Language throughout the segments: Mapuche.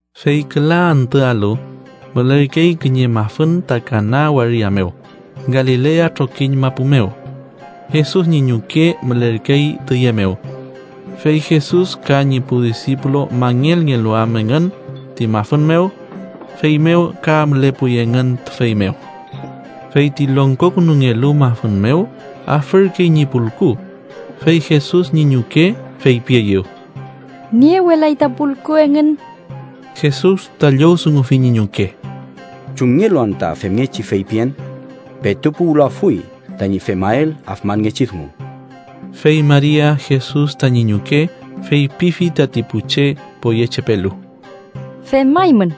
Fey küla antüalu, mülerkey kiñe mafün ta Kana waria mew, Galilea trokiñ mapu mew. Jesus ñi ñuke mülerkey tüye mew. Fey Jesus ka ñi pu disipulu mangelngelu am engün ti mafün mew, feymew ka mülepuy engün tüfey mew. Fey ti longkokünungelu mafün mew afürkey ñi pulku, fey Jesus, ñi ñuke feypieyew: —Niewelay ta pulku engün. Jesus ta llowdungufi ñi ñuke: —¿Chumngelu anta femngechi feypien? Petu puwlafuy tañi femael afmanngechi dungu. Fey Maria, Jesus tañi ñuke, feypifi tati pu che poyechepelu: —Femaymün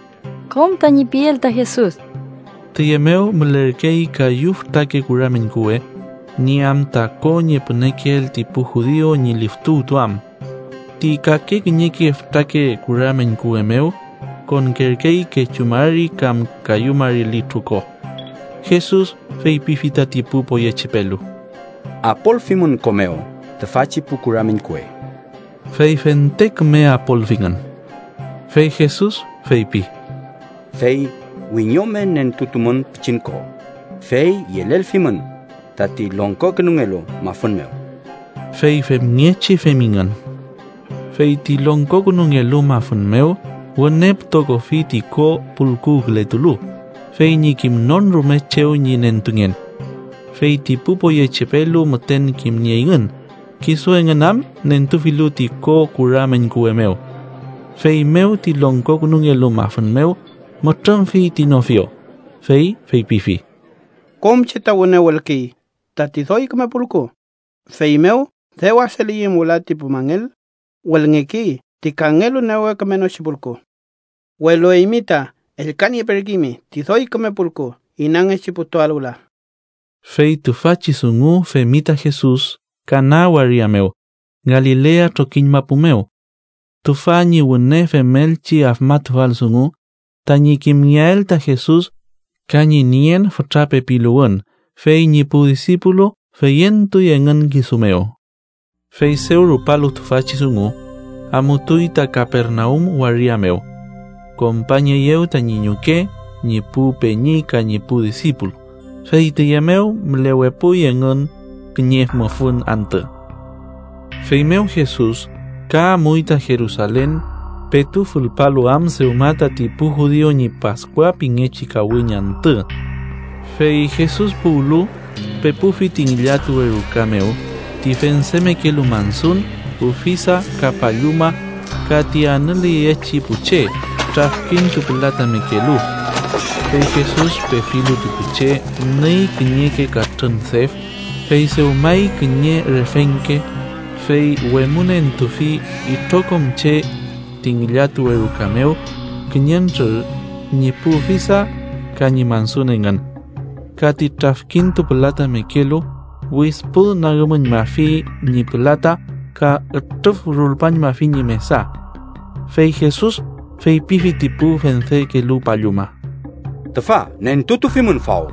kom tañi piel ta Jesus. Tiye mew mülerkey kayu fütrake kura meñkuwe, nieam ta ko ñi pünekeel ti pu judiu ñi liftuwtuam. Ti kake kiñeke fütrake kura meñkuwe mew konkerkey kechu mari kam kayu mari litru ko. Jesus feypifi tati pu poyechepelu: —Apolfimün ko mew tüfachi pu kura meñkuwe. Fey fente küme apolfingün. Fey Jesus feypi: —Fey wiñome nentutumün pichin ko, fey yelelfimün tati longkokünungelu mafün mew. Fey femngechi femingün. Fey ti longkokünungelu mafün mew wüne pütokofi ti ko pulkuwkületulu, fey ñi kimnon rume chew ñi nentungen. Fey ti pu poyechepelu müten kimnieyngün, kisu engün am nentufilu ti ko kura meñkuwe mew. Feymew ti longkokünungelu mafün mew mütrümfi ti nofio, fey feypifi: —Kom che ta wüne wülkey tati doy küme pulku, feymew dew aseleweyüm wüla ti pu mangel, wülngekey ti kangelu newe kümenochi pulku. Welu eymi ta ellka nieperkeymi ti doy küme pulku inangechi putuael wüla. Fey tüfachi dungu femi ta Jesus Kana waria mew, Galilea trokiñ mapu mew. Tüfa ñi wüne femelchi afmatufal dungu, tañi kimngeael ta Jesus ka ñi nien fütra pepiluwün. Fey ñi pu disipulu feyentuy engün kisu mew. Fey dew rupalu tüfachi dungu, amutuy ta Kapernaum waria mew. Kompañeyew tañi ñuke, ñi pu peñi ka ñi pu disipulu, fey tüye mew mülewepuy engün kiñe mufün antü. Feymew Jesus ka amuy ta Jerusalen petu fülpalu am dewma tati pu judiu ñi Paskua pingechi kawiñ antü. Fey Jesus puwlu, pepufi ti ngillatuwe ruka mew ti fendemekelu mansun, ufisa ka palluma ka ti anüleyechi pu che trafkintupülatamekelu. Fey Jesus pefilu ti pu che, nüy kiñeke katrün def, fey dewmay kiñe refengke, fey wemünentufi itrokom che ti ngillatuwe ruka mew kiñentrür ñi pu ufisa ka ñi mansun engün. Ka ti trafkintupülatamekelu widpünagümüñmafi ñi pülata ka ütrüfrulpañmafi ñi mesa. Fey Jesus feypifi ti pu fendekelu palluma: —¡Tüfa nentutufimün faw!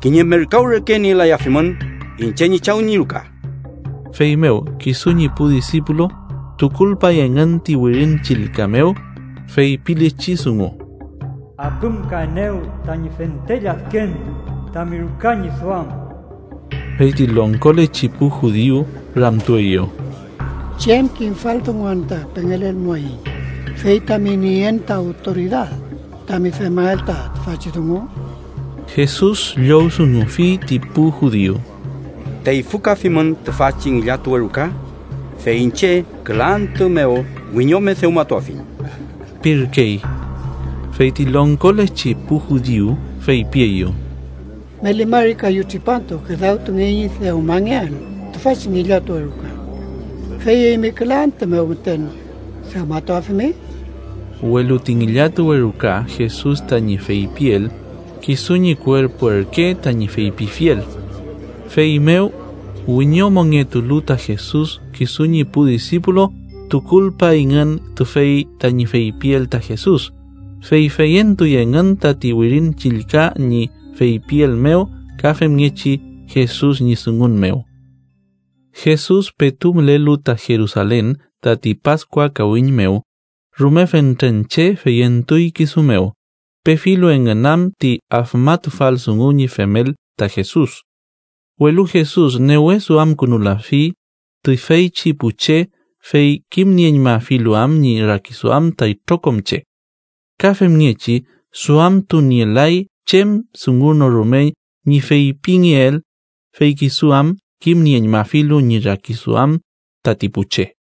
¡Kiñe merkaw reke nielayafimün iñche ñi Chaw ñi ruka! Feymew kisu ñi pu disipulu tukulpay engün ti Wirin Chillka mew feypilechi dungu: “Apümkaenew tañi fente lladken tami ruka ñi duam.” Feyti longkolechi pu judiu ramtueyew: —¿Chem kimfal dungu anta pengelelmuaiñ fey tami nien ta awtoridad tami femael ta tüfachi dungu? Jesus llowdungufi ti pu judiu: —Teyfükafimün tüfachi ngillatuwe ruka, fey iñche küla antü mew wiñome dewmatuafiñ ―pirkey. Fey ti longkolechi pu judiu feypieyew: —Meli mari kayu tripantu küdawtungey ñi dewmangeael tüfachi ngillatuwe ruka. ¿Fey eymi küla antü mew müten dewmatuafimi? Welu ti ngillatuwe ruka Jesus tañi feypiel, kisu ñi kuerpu ürke tañi feypifiel. Feymew, wiñomongetulu ta Jesus kisu ñi pu disipulu tukulpayngün tüfey tañi feypiel ta Jesus, fey feyentuy engün tati Wirin Chillka ñi feypiel mew ka femngechi Jesus ñi dungun mew. Jesus petu mülelu ta Jerusalen tati Paskua kawiñ mew, rume fentren che feyentuy kisu mew, pefilu engün am ti afmatufal dungu ñi femel ta Jesus. Welu Jesus newe duamkünulafi tüfeychi pu che, fey kimnieñmafilu am ñi rakiduam ta itrokom che. Ka femngechi duamtunielay chem dungu no rume ñi feypingeael, fey kisu am kimnieñmafilu ñi rakiduam tati pu che.